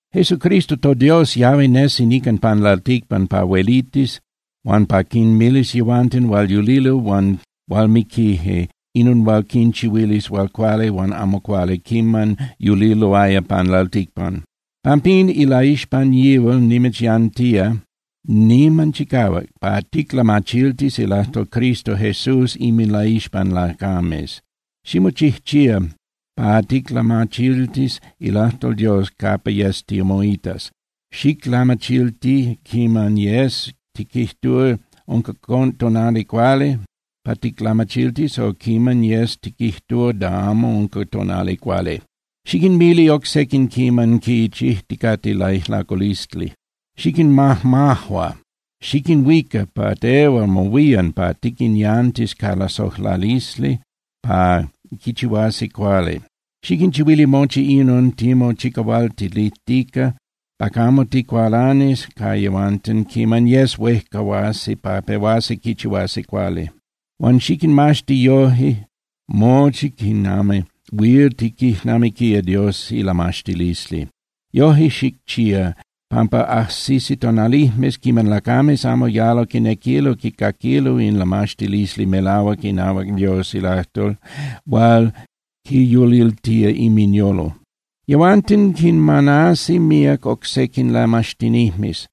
Jesucristo toDios yahui nesi nican pan lalticpan pa huelitis huan pa quinmilis yehuanten hual yulilo huan hual miquije inon hual quinchihuilis hual cuali huan amo cuali quiman yuliloaya pan lalticpan. Pampín, ilaixpan yihual nimitzyantía niman chicahuac pa ticlamachiltis ilajtol Cristo Jesús inminlaixpan lacames. Ximochijchía pa ticlamachiltis ilajtol Dios capa yes timoitas, xiclamachilti quiman yes tiquijtúa unca tonali cuali pa ticlamachiltis, o quiman yes tiquijtúa da amo unca tonali cuali. Xiquinmili oc sequin quiman quichijticate laijlaculisli. Xiquinmajmajua, xiquinhuica pa tehual mohuían pa tiquinyantis ca lasojlalisli pa quichihuasi cuali. Xiquinchihuili mochi inon timochicahualtilijtica pa camo ticualanis ca yehuanten quiman yes huejcahuasi pa pehuasi quichihuasi cuali. Huan xiquinmaxti yoje mochi quinami huil tiquijnamiquía Dios ilamaxtilisli. Yoje xicchía pampa ajsisi tonalijmes quiman lacames amo yalo quinequilo quicaquilo in lamaxtilisli melahuac inahuac Dios ilajtol hual quinyuliltía inminyolo. Yehuanten quinmanasi míac oc sequin lamaxtinijmes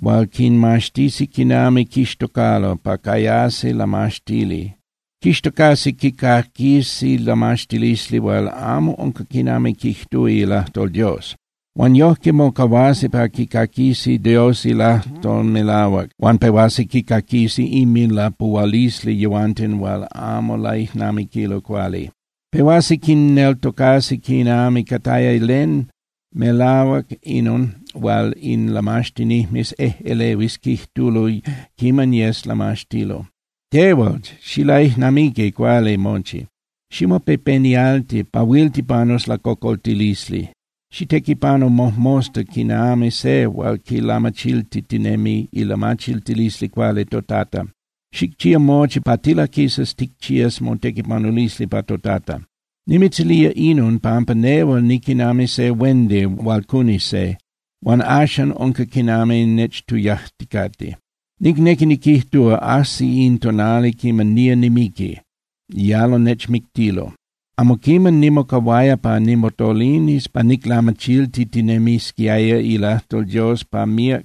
hual quinmaxtisi quinami quixtocalo pa cayasi lamaxtili. Quixtocasi quicaquisi lamaxtilisli hual amo unca quinami quijtúa ilajtol Dios. Huan yojque mocahuasi pa quicaquisi Dios ilajtol melahuac, huan pehuasi quicaquisi inminlapuhualisli yehuanten hual amo laijnamiquilo cuali. Pehuasi quinneltocasi quinami cataya len melahuac inon hual in lamaxtinijmes ejꞌelehuis quijtulo quiman yes lamaxtilo. Tehual, xilaijnamiqui cuali mochi, ximopepenialti pa huil tipanus lacocoltilisli. Xitequipanu mojmosta quinami se hual quilamachiltitinemi ilamachiltilisli cuali toTata. Xicchía mochi pa tilaquisas ticchías motequipanulisli pa toTata. Nimitzilía inon, pampa nehual niquinami se huendi hual cuni se, huan axan unca quinami nechtuyajticate. Nicnequi niquijtúa, ajsi in tonali quiman nía nimiqui, yalo nechmictilo. Amo quiman nimocahuaya pa nimotolinis pa niclamachiltitinemisquiaya ilajtol Dios pa míac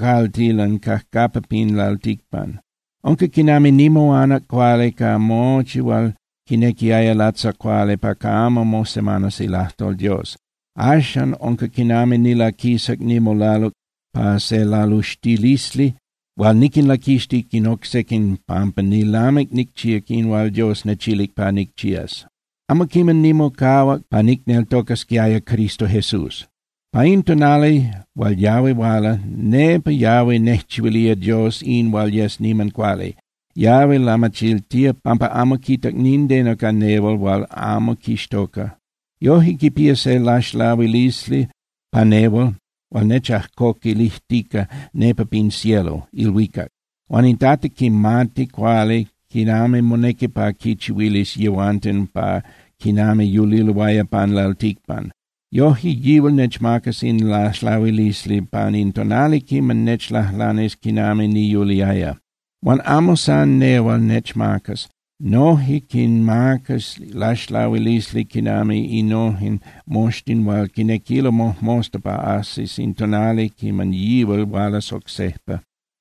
caltilan cajcapa pin lalticpan. Unca quinami nimoanac cuali ca mochi hual quinequiaya latzacuali pa camo mosemanas ilajtol Dios. Axan unca quinami nilaquisac nimolaluc pa se laluxtilisli hual niquinlaquixtic in oc sequin pampa nilamic nicchíac in hual Dios nechilic pa nicchías. Amo quiman nimocahuac pa nicneltocasquiaya Cristo Jesús. Pa in tonali hual yahui huala, nepa yahui nejchihuilía Dios in hual yes niman cuali. Yahui lamachiltía pampa amo quita nindeno ca nehual hual amo quixtoca. Yoje quipía se laxlahuilisli pa nehual hual nechajcoquilijtica nepa pin cielo (ilhuicac). Huan in Tata quimati cuali quinami monequi pa quinchihuilis yehuanten pa quinami yuliloaya pan lalticpan. Yoje, yihual nechmacas in laxlahuilisli pan in tonali quiman nechlajlanis quinami niyuliaya. Huan amo san nehual nechmacas. Noje quinmacas laxlahuilisli quinami inon moxtin hual quinequilo mojmosta pa ajsis in tonali quiman yihual hualas oc sejpa.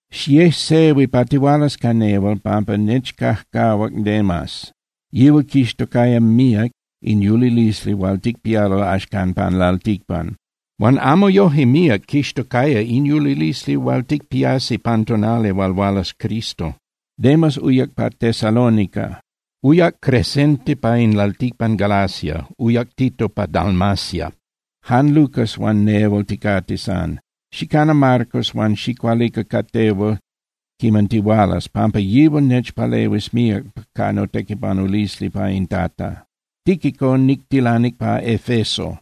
Xiejsehui pa tihualas ca nehual, pampa nechcajcahuac Demas. Yihual quixtocaya míac in yulilisli hual ticpialo axcan pan lalticpan, huan amo yoje míac quixtocaya in yulilisli hual ticpiasi pan tonali hual hualas Cristo. Demas uyac pa Tesalónica. Uyac Crescente pa in lalticpan Galacia, uyac Tito pa Dalmacia. Jan Lucas huan nehual ticate san. Xicana Marcos huan xicualica ca tehual quiman tihualas, pampa yihual nechpalehuis míac ca notequipanulisli pa in Tata. Tíquico nictilanic pa Efeso.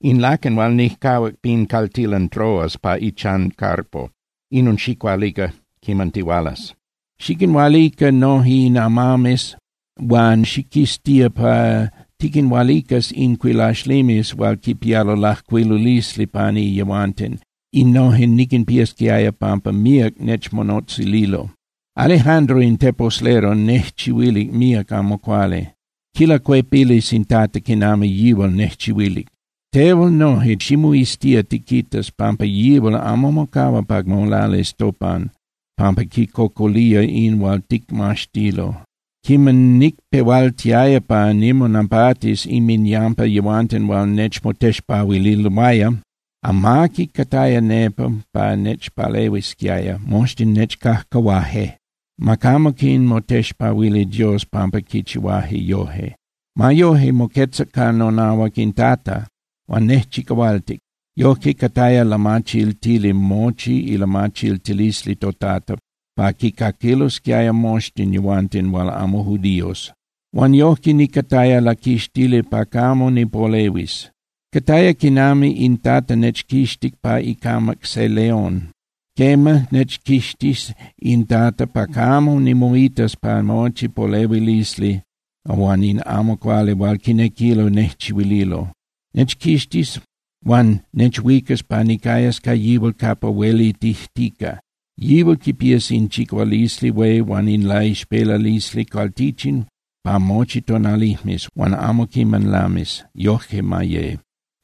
In laquen hual nijcahuac pin caltilan Troas pa ichan Carpo, inon xicualica quiman tihualas. Xiquinhualica noje in amames, huan xiquiztía pa tiquinhualicas in cuilaxlimes hual quipialo lajcuilulisli pani yehuanten, innojen niquinpiasquiaya pampa míac nechmonotzililo. Alejandro in teposlero nejchihuilic míac amo cuali. Quilacuepilis in Tata quinami yihual nejchihuilic. Tehual noje ximoiztía tiquitas, pampa yihual amo mocahua pa molalis topan pampa quicocolía in hual ticmaxtilo. Quiman nicpehualtiaya pa nimonapatis inminyampa yehuanten hual nechmotexpahuililoaya, amaqui cataya nepa pa nechpalehuisquiaya, moxtin nechcajcahuaje. Ma camo quinmotexpahuili Dios pampa quichihuaje yoje. Ma yoje, moquetzac ca nonahuac in Tata huan nejchicahualtic. Yojque cataya lamachiltili mochi ilamachiltilisli toTata, pa quicaquilosquiaya moxtin yehuanten hual amo judíos. Huan yojque nicataya laquixtili pa camo nipolehuis. Cataya quinami in Tata nechquixtic pa icamac se león. Quema, nechquixtis in Tata pa camo nimoitas pa mochi polehuilisli huan in amo cuali hual quinequilo nejchihuililo. Nechquixtis huan nechhuicas pa nicayas ca yihual capa huelitijtica. ¡Yihual quipías in chicahualisli hué huan in laixpelalisli cualtichin pa mochi tonalijmes, huan amo quiman lamis! Yojque ma ye.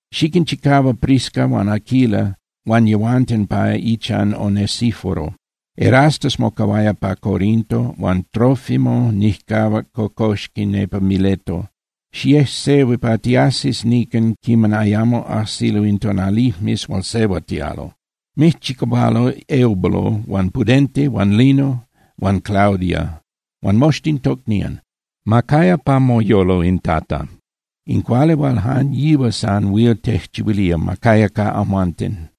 Xiquinchicahua Prisca huan Aquila huan yehuanten pa ichan Onesíforo. Erasto mocahuaya pa Corinto, huan Trófimo nijcahuac cocoxqui nepa Mileto. Xiejsehui pa tiajsis nican quiman ayamo ajsilo in tonalijmes hual sehuatíalo. Mijchicahualo Eubulo huan Pudente huan Lino huan Claudia huan moxtin tocnían. Ma caya pa moyolo in Tata. In cuali hual jan yihual san huil tejchihuilía ma caya ca amhuanten.